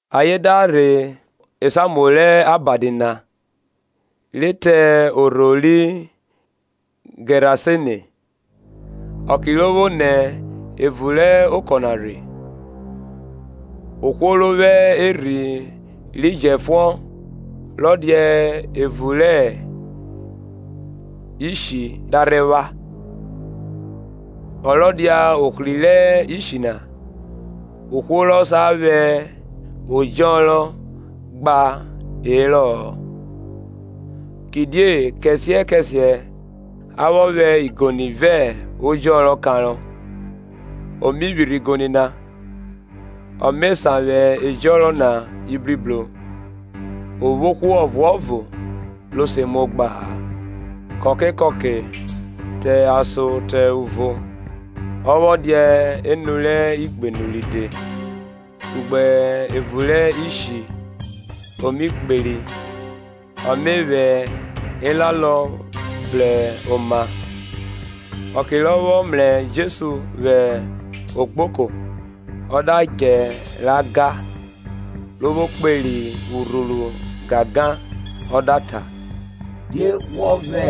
Ayen da rhe esamuo rẹ abadi na, re te orho ri Gẹrasene. Ọke ro vwo nẹ evun rẹ okọ na rhe, ohwo ro vwo erhi ro jẹfuọn rọ dia evun rẹ ishi da rhe vwa, Ọ rọ dia ohri rẹ ishi na; ohwo rọ sa vwẹ ọjọnrọn gba hẹrọ-ọ; Kidie kẹsiẹ kẹsiẹ a vwọ vwẹ igoni vẹ ẹjọnrọn kanrọ, o mi vwirhi igoni na, ọ me sanvwe ẹjọnrọn na ibribro o vwo ohwo ọvuọvo ro se muo gba-a. Kọke kọke, te ason te uvo, ọ vwọ dia enu rẹ igbenu ride, kugbe evun rẹ ishi, o mi kperi, ọ mẹ vwẹ ẹlalọ bru oma. Ọke rọ vwọ mrẹ Jesu vwẹ ogboko, ọ da djẹ ra ga; ro vwo kperi urhuru gangan, ọ da ta, Die wọ vwẹ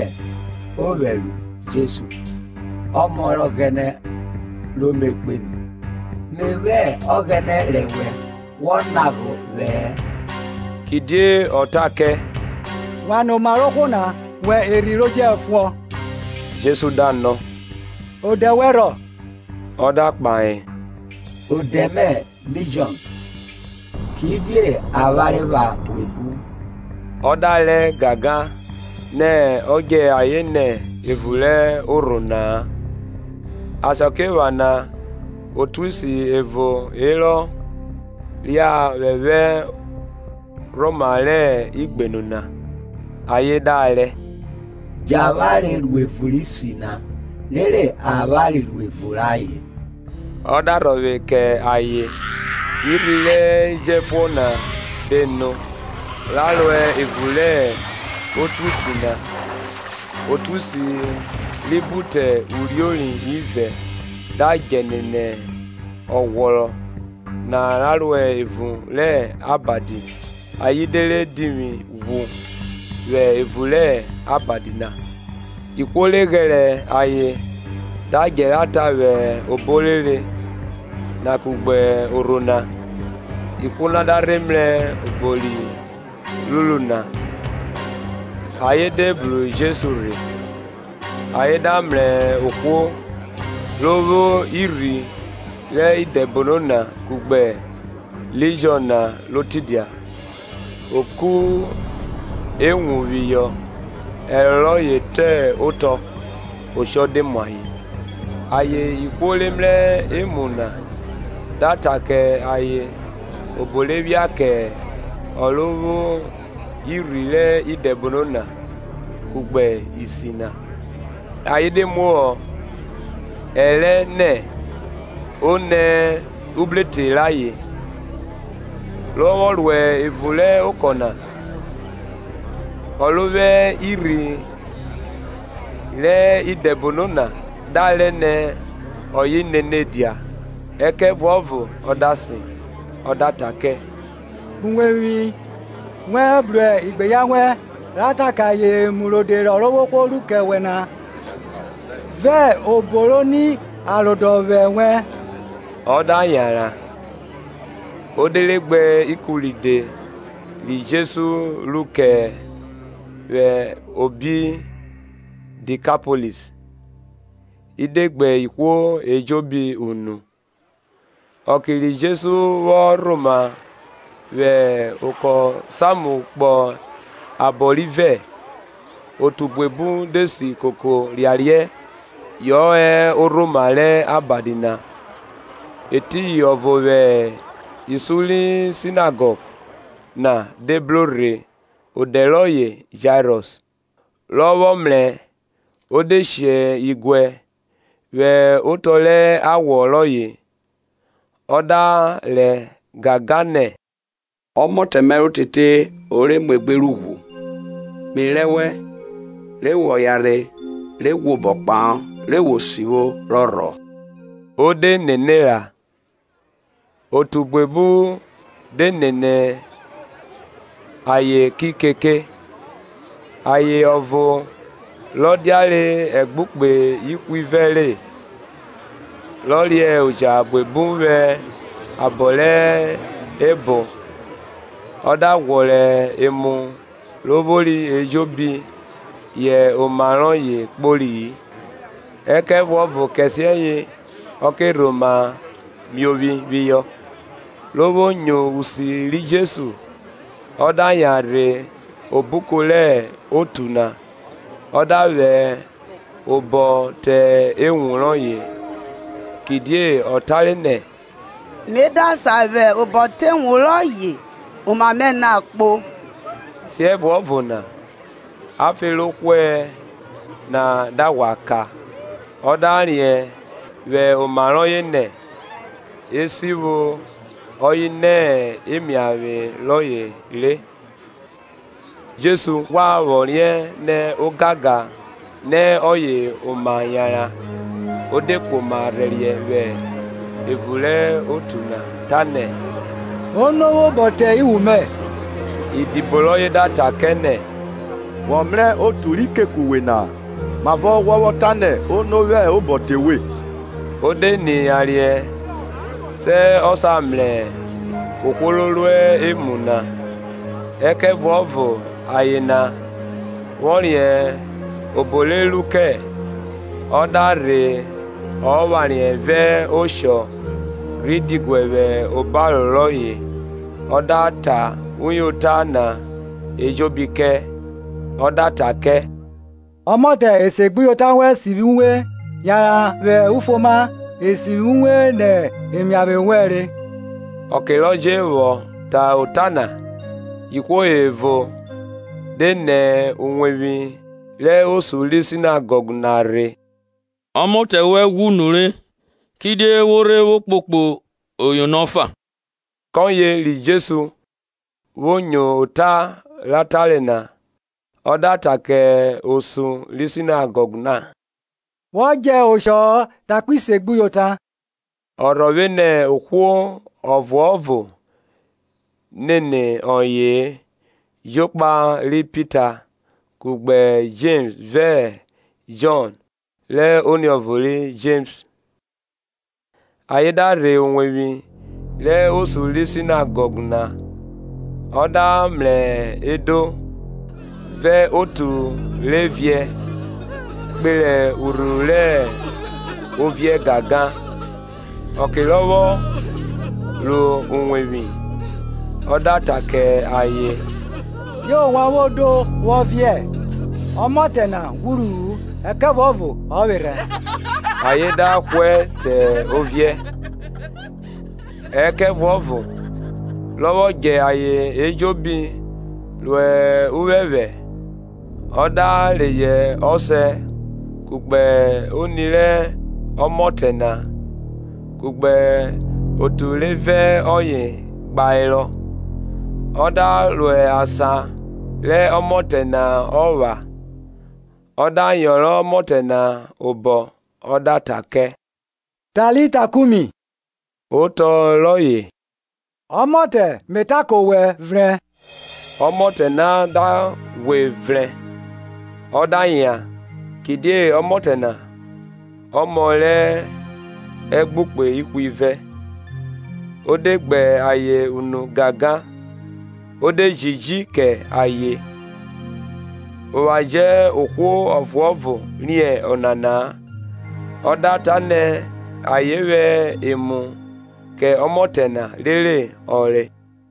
ovwẹ ru Jesu, Ọmọ rẹ Ọghẹnẹ ro me Kpenu? Me vwẹ Ọghẹnẹ rẹ wẹ, wọ lagha ovwẹ-ẹ. Kidiẹ ọ ta kẹ, Wan nẹ oma re ohwo na, wẹ erhi ro jẹfuọn. Jesu da nọ, Odẹ wẹn rhọ? Ọ da kpahe, Odẹ mẹ Lijọn: kidie avwanre pha buebu. Ọ da rẹ gangan nẹ ọ djẹ ayen nẹ evun rẹ orho na-a. Asakiephana otuisi ẹvo herọ ria vwẹ vwẹ orhoma rẹ ugbenu na. Ayen da rẹ, Djẹ avwanre ro evun rẹ isi na rere avwanre ro evun rẹ ayen. Ọ da rhọvwe kẹ ayen. Irhi ri jẹfnọn na de no, ra ro evun rẹ otuisi na; otuisi ri bu te uriori ivẹ da djẹ nene ọghwrọrọ na ra ro evun rẹ abadi ayen de re divwi ghwu vwẹ evun rẹ abadi na. Ihwo re ghẹrẹ ayen da djẹ ra ta vwẹ obo orere na kugbe orho na. Ihwo da rhe mrẹ obo ri ruru na. Ayen de bru Jesu rhe, ayen da mrẹ ohwo ro vwo irhi rẹ idẹbono na kugbe Lijọn na ro tidia, o ku ewun phihọ ẹro rọye te otọ oshọ de mu ayen. Ayen ihwo re mrẹ emu na da ta kẹ ayen obo rẹ phia kẹ ọ ro vwo irhi rẹ idẹbono na, kugbe isi na. Ayen de muhọ ẹrẹ nẹ o nẹ ubrotọ rayen. Rọ vwọ ruẹ evun rẹ okọ na, ọ ro vwo irhi rẹ idẹbono na da rẹ ne ọye nene dia. Ẹkẹvuọvo ọ da sen, ọ da ta kẹ, Kpo uwevwi wẹn bru igbeyan wẹn, ra ta kẹ ayen emu rode rẹ Ọrovwohwo ru kẹ wẹ na, vẹ obo ro ni arodọvwẹ wẹ. Ọ da yanran, o de re gbe ikun ride ri Jesu ru kẹ vwẹ obi Dikapolis, i de gbe ihwo ejobi unu. Ọke ri Jesu vwọ rhoma vwẹ okọ samu kpọ abọ rivẹ, otu buebu de si koko riariẹ yọ hẹ orhoma rẹ abadi na. Eriyin ọvo vwẹ isun ri sinagọg na de bro rhe odẹ rọye Jairọs, rọ vwọ mrẹ, o de she diguẹ vwẹ otọ rẹ awọ rọye, Ọ da rẹ gangan, nẹ, Ọmotẹ mẹ rẹ otete herọ muegbe rẹ ughwu. mẹ rẹ wẹ, re wọ yanrhe re ghwẹ obo kpahọ, re wo sivwo, rọ rhọ. O de nene ra. Otu buebu de nene ayen ki keke. Aye ọvo rọ diare ẹgbukpe ihwivẹ re, rọ re oja buebu vwẹ abọ rẹ cho, ọ da ghwọrọ emu ro vwori ejobi yẹ oma rọye kpori-i, ẹkẹvuọvo kẹsiẹyẹ ọ kẹ rhoma miovwi phihọ. ro vwo nyo usi ri Jesu, ọ da yan rhe obuko rẹ otu na, ọ da vwẹ obọ te ewun rọye. Kidie ọ tare nẹ, Mẹ da sa vwẹ obọ te ewun rọye oma mẹ na kpo. Siẹvuọvo na afe ro hwẹ na da ghwa ka; ọ da riẹn vwẹ oma rọye nẹ, esivwi ọye nẹ emiavwe rọye re. Jesu ghwa vwọ riẹn nẹ ogangan nẹ ọye oma yanran, o de knoma rhẹriẹ vwẹ evun rẹ otu na ta nẹ, Ono vwẹ obọ te iwun mẹ? Idibo rọye da ta kẹ nẹ. Wọ mrẹ otu ri keke uwe na, mavọ wọ vwọ ta nẹ, Ono vwẹ obọ te vwe? O de ni yariẹ sẹ ọ sa mrẹ ohwo ro ru emu na. Ẹkẹvuọvo aye na, vwọ riẹn obo re ru kẹ, ọ da rhe ọ phariẹ vẹ oshọ, rhi diguẹ vwẹ obaro rọye ọ da ta uyota na ejobi kẹ. Ọ da ta kẹ, Ọmọtẹ esegbuyota wẹn sivwi uwe, yanran vwẹ ufuoma, e sivwi uwe nẹ emiavwe wẹn re. Ọke rọ jẹ vwọ ta ota na, ihwo ẹvo de nẹ uwevwi rẹ osun ri sinagọg na rhe, Ọmọtẹ wẹn ghwu nure kidie wo rhe vwo kpokpo Oyono ọfa? Kọye ri Jesu vwo nyo ota ra tare na, ọ da ta kẹ osun ri sinagọg na, Wọ djẹ oshọ-ọ, takpi segbnyota. Ọ rhọvwe nẹ ohwo ọvuọvo nene ọye-e, jokpa ri Pita, kugbe Jems vẹ Jọn rẹ oniọvo ri Jems. Ayen da rhe uwevwi rẹ osun ri sinagọg na. ọ da mrẹ edo, vẹ otu re viẹ kpere urhuru rẹ oviẹ gangan. Ọke rọ vwọ ro uwevwi, ọ da ta kẹ ayen Die ovwan vwo do, vwọ viẹ? Ọmọtẹ na ghwuru-u, ẹkẹvuọvo ọ vwerhẹ. Ayen da hwẹ te oviẹ. Ẹkẹvuọvo rọ vwọ djẹ ayen ejobi ro uphẹphẹ, ọ da reyọ ọsẹ kugbe oni re ọmọtẹ na, kugbe otu re vẹ ọye gba herọ, ọ da ro asan rẹ ọmọtẹ na epha. Ọ da yọnrọn ọmọtẹ na obọ, ọ da ta kẹ Talita kumi; otọ rọye, Ọmọtẹ, me ta kẹ owẹ, vrẹn. Ọmọtẹ na de ghwe vrẹn, ọ da yan; kidie ọmọtẹ na ọmọ rẹ ẹgbukpe ihwivẹ. O de gbe ayen unu gangan. O de jiji kẹ ayen, ovwan jẹ ohwo ọvuọvo riẹn ọnana-a. ọ da ta nẹ ayen vwẹ emu kẹ ọmọtẹ na rere ọ re.